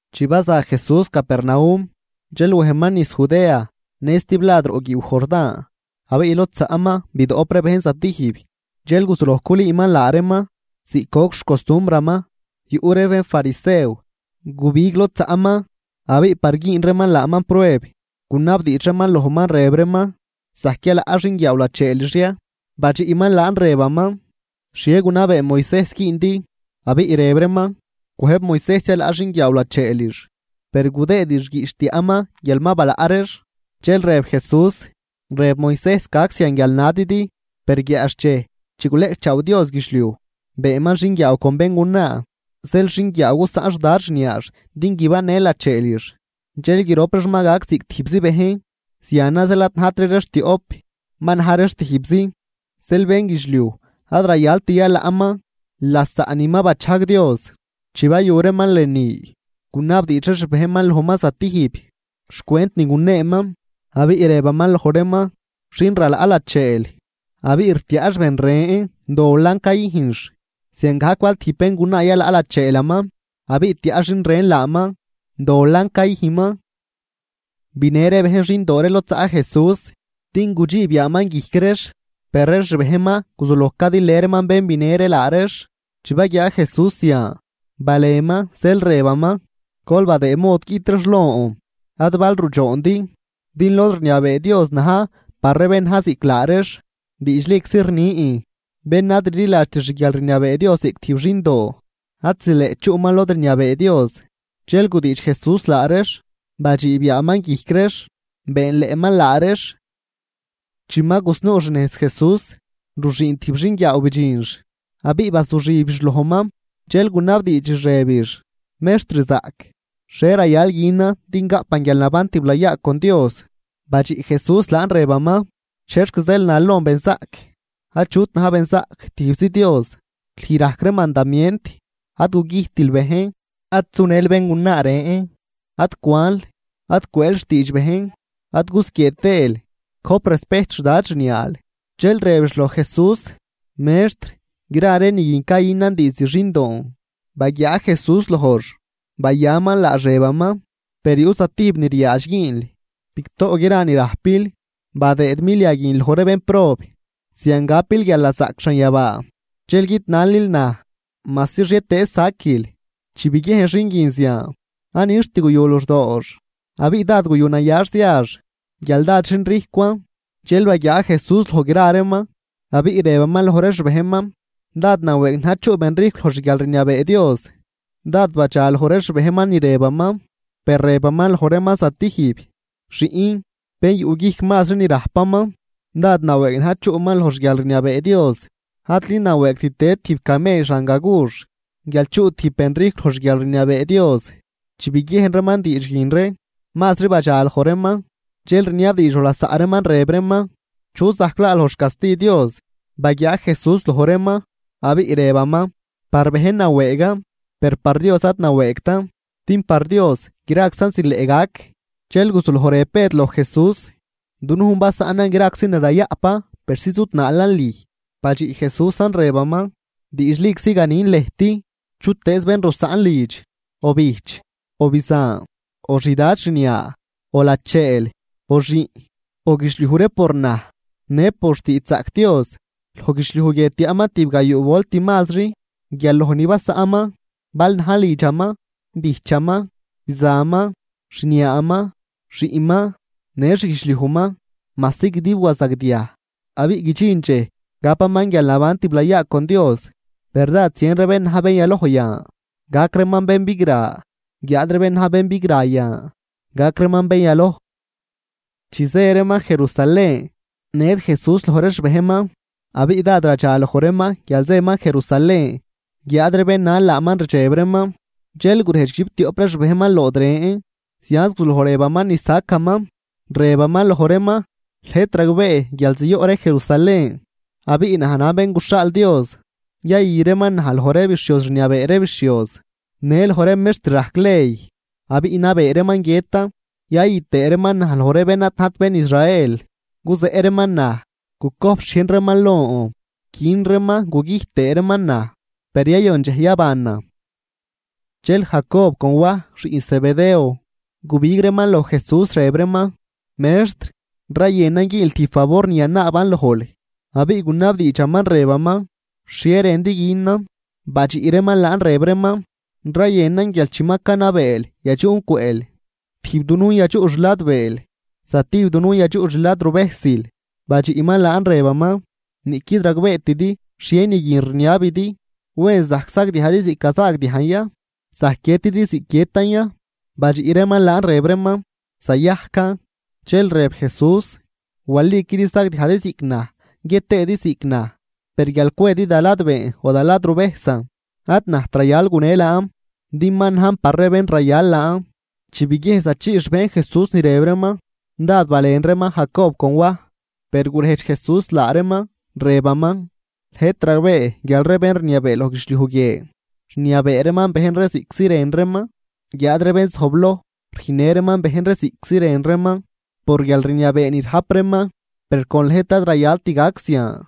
Chi baza Jesús Capernaum, dxel wejman niz Judea në stiblad roꞌ guiiw Jordán. Abiꞌ lod zaꞌman bidoꞌp ree bejn zatijb, dxel guzuloj culüüman laa reeman ziꞌc goc xcostumbraman. Yuꞌ ree bénfarisew gubig lod zaꞌman. Abiꞌ par güün reeman laaman prueb, gunabdiidx reeman lojman rëb reeman: ―¿Zajc yalaꞌ xinguiaaw lacheelix ya? Badxiꞌman laan rëbaman: ―¿Xhie gunabee Moisejs güündi? Abiꞌ rëb reeman: ―Cwëjb Moisejs yalaꞌ xinguiaaw lacheelix, per gudëëdix guiꞌch tiaꞌman guial ma balaꞌ reex. Dxel rëb Jesús: ―Rëb Moisejs gac zian guial nadidi. Per guiaꞌxchej chi guleꞌcchaaw Dios guidxliuj, “beenman xinguiaaw con béngunaa”. “Zeel xinguiaaw gusaꞌn xdad xniaax din guibannë lacheelix, dxel grop reex ma gac ziꞌc tijbzi bejn.” Zianan zeel ad najtri reex tioꞌp, ma na̱j reex tijbzi. Zeel, bénguidxliuj ad rayalt yalaꞌman lasaꞌ ni ma bachajg Dios. Chi bayu reeman lënü, gunabdiidx ree xbejnman lojman zatijb, xcwent ni guneeman. Abiꞌ rëbaman loj reeman: ―Xin ralaꞌ lacheel, abiꞌ rtiaꞌx ben ren dolan cayüjnx, ziangajc bal tijb béngunaa yalaꞌ lacheelaman abiꞌ tiaꞌ xin ren laaman, dolan cayüjnman. Binë ree bejn xindoo ree lod zaꞌ Jesús din gudxiib yaaman guijc reex. Per ree xbejnman guzuloj cadilë reeman bén binë ree laa reex. Chi baguiaa Jesús zian, balenman zeel rëbaman: ―Gol badëëd mod guiꞌt reex lon, ad bal rudxoondi. Din lod rniabee Dios na̱j par ree bén na̱j ziꞌc laa reex. Diidxliczi rnin, bén ad rliladxt xguialrniabee Dios ziꞌc tijb xindoo, ad zileꞌt chuꞌman lod rniabee Dios. Dxel gudiidx Jesús laa reex, badxiib yaaman guijc reex, beenleꞌman laa reex. Chi ma gusnuu xnejz Jesús, ruxüün tijb xinguiaaw bidxinx abiꞌ bazuxibix lojman, dxel gunabdiidxix rëbix: ―Mextr zaꞌc, ¿xhie rayal günan din gaꞌpan guialnaban tiblayaa con Dios? Badxiꞌ Jesús laan rëbaman: ―¿Chexc zeel nal lon benzaꞌc? Achut na̱j benzaꞌc, tijbzi Dios. Lüj rajc ree mandamient, “Ad gugüjtil bejn, ad sunël béngunaa ren, ad cwanl, ad cwëël xtiidx bejn ad gusquiee tëël, gojp respejt xdad xniaal.” Dxel rëbix loj Jesús: ―Mextr, gra ree ni guin cayünan diizd xindoon. Baguiaa Jesús lojx, bayaman laax, rëbaman: ―Per yuꞌ zatijb ni riaadx güünl: bigtoꞌ gra ni rajpil, badëëd milia guin loj ree bénprob, zian gapil guialnazaꞌc xanyabaa dxel guidnalil naj majsi xhietëëz saquil. Chi biguiejn xin guin zian, ad nixt guyu luxdoox abiꞌ dád yuꞌnayax ziax guial dád xinrijcwan. Dxel baguiaa Jesús loj gra reeman, abiꞌ rëbaman loj ree xbejnman: ―¡Dád nawëëg na̱j chuꞌ benrijcw loj xguialrniabee Dios! Dád badxa loj ree xbejnman ni rëbaman. Per rëbaman loj reeman zatijb: ―Xiꞌn, ¡bén yuꞌguijc mazri ni rajpaman, dád nawëëg na̱j chuꞌman loj xguialrniabee Dios! Adli nawëëgt tëd tijb camell xan gagux guial chuꞌ tijb benrijcw loj xguialrniabee Dios. Chi biguien reeman diidx guin ree, mazri badxa loj reeman, dxel rniabddiidx loj lasaꞌ reeman, rëb reeman: ―¿Chu zajc laa loj xcasti Dios? Baguiaa Jesús loj reeman, abiꞌ rëbaman: ―Par bejn nawëëgan, per par Dios ad nawëëgtan din par Dios graczan zileꞌ gac. Dxel guzuloj rëb Bëd loj Jesús: ―Dunujn basaꞌnan graczi ni rayaꞌpan persi zudnaalan lüj. Badxiꞌ Jesúsan rëbaman: ―Diidxliczi ganin lëjt, chutëëz bén rusaꞌn lidx, o bijch, o bizan, o xdad xniaa, o lacheel o xiꞌn, o guidxliuj ree por naj në por xtiidxzaꞌc Dios, loj guidxliuj guie tiaꞌman tibgayuu volt mazri guial loj ni basaꞌnman, bal najn lidxaman, bijchaman, bizanman, xniaaman, xiꞌnman, në xguidxliujman, majsi guidib wazagdiaj, abiꞌ guidxin dxej gapaman guialnaban tiblayaa con Dios. Per dád zien ree bén na̱j bén yaloj yan, gac reeman bén bigra, guiáad ree bén na̱j bén bigra yan, gac reeman bén yaloj. Chi zë reeman Jerusalén, ned Jesús loj ree xbejnman, abiꞌ dád radxaloj reeman guial zëman Jerusalén, guiáad ree bén nal laaman rdxeb reeman. Dxel gurejdx guidxiptioꞌp ree xbejnman lood ren, zianz guzuloj rëbaman ni sacaman: ―Rëbaman loj reeman: Lëjt ragbee guial ziyoꞌ ree Jerusalén, abiꞌ naj najn Bén guxhaal Dios, yayü reeman naj loj ree bixhioz rniabee ree bixhioz, në loj ree mextr rajc ley. Abiꞌ nabee reeman guiëtan, yayü tëë reeman naj loj ree bén ad najt bén Israel. Guzeꞌ reeman naj, gucojp xhiejn reeman lon, quin reeman gugüjt tëë reeman naj, per yayon dxej yabanan. Dxel Jacob con Waj xiꞌn Zebedeo, gubig reeman loj Jesús rëb reeman: ―Mextr, rayënan güünl tijb favor ni yanaaban lojl. Abiꞌ gunabdiidxaman rëbaman: ―¿Xhie rëndi günan? Badxiꞌ reeman laan rëb reeman: ―Rayënan guial chi ma canabeel, yadxuꞌn cwëꞌl, tijb dunujn yadxuꞌ xladbeel, zatijb dunujn yadxuꞌ xladruvejsil. Badxiꞌman laan rëbaman: ―Niꞌquid ragbeetidi xhie ni guin rniabidi. ¿Wen zajc sagdiajdi ziꞌc gazaagdiajn ya? ¿Zajc guiëtidi ziꞌc guiëtan ya? Badxiꞌ reeman laan rëb reeman: ―Zayajcan. Dxel rëb Jesús: ―Waliquidi sagdiajdi ziꞌc naj guiët tëëdi ziꞌc naj, per guial cwedi da ladbeen o da ladruvejsan, ad najt rayal gune laan, din ma najn par ree bén rayal laan. Chi biguien zachii xbejn Jesús ni rëb reeman, dád balen reeman Jacob con Waj, per gurejdx Jesús laa reeman rëbaman: ―Lëjt ragbee guial ree bén rniabee loj guidxliuj guie, rniabee reeman bejn ree ziꞌctzi rën reeman, guiáad ree bén zojbloj rüjnnë reeman bejn ree ziꞌctzi rën reeman por guialrniabee ni rajp reeman. Per con lëjt ad rayalt gac zian.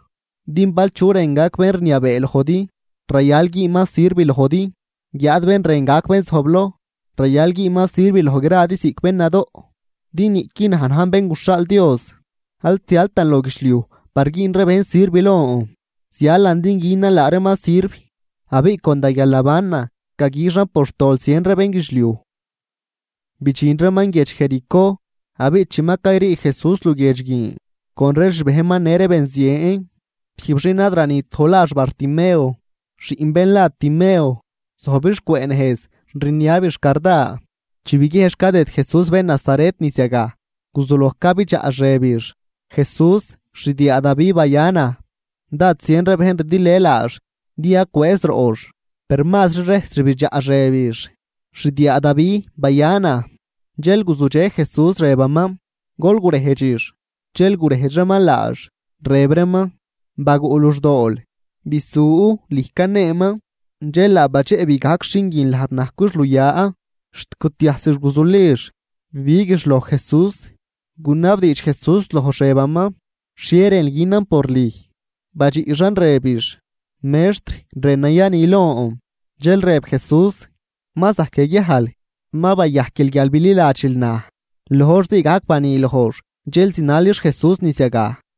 Din bal chu rën gac bén rniabee lojdi, rayal güünman sirv lojdi, guiáad bén rën gac bén zojbloj, rayal güünman sirv loj gradi ziꞌc bén nadoꞌ. Din niꞌqui naj najn Bén guxhaal Dios, ad zialtan loj guidxliuj par güün ree bejn sirv lon, zialan din günan laa reeman sirv, abiꞌ con da guialnabanan gaguixan por xtol zien ree bénguidxliuj. Bidxin reeman guiedx Jericó, abiꞌ chi ma cayrii Jesús luguiedx guin, con ree xbejnman në ree benzien. Tijb xin ad ranit loj lax Bartimeo, xiꞌn bén la Timeo, zojbix cwëꞌ nejz rniabix carda. Chi biguiejnx cadëd Jesús bén Nazaret niz yagaj, guzuloj cabidxaꞌx rëbix: ―¡Jesús, xdiaa Davi, baya naj! Dád zien ree bejn ridilë laax din yacwëëz roꞌx. Per mazri rejs rbidxaꞌx rëbix: ―¡Xdiaa Davi, baya naj! Dxel guzudxe Jesús rëbaman: ―Gol gurejdxix. Dxel gurejdx reeman laax, rëb reeman: ―Baguꞌ luxdool, bisu, lüj caneeman. Dxel laa badxeꞌbi gajc xin guin lajd najcwix luya, xt gutiajsix guzulix bibiguix loj Jesús. Gunabdiidx Jesús lojx rëbaman: ―¿Xhie rënl günan por lüj? Badxiꞌxan rëbix: ―Mextr, rënan yani lon. Dxel rëb Jesús: ―Ma zajc yaguiajl, ma bayajquil guial bililadxil naj. Loj hor zii gajc bani lojx dxel zinalix Jesús niz yagaj.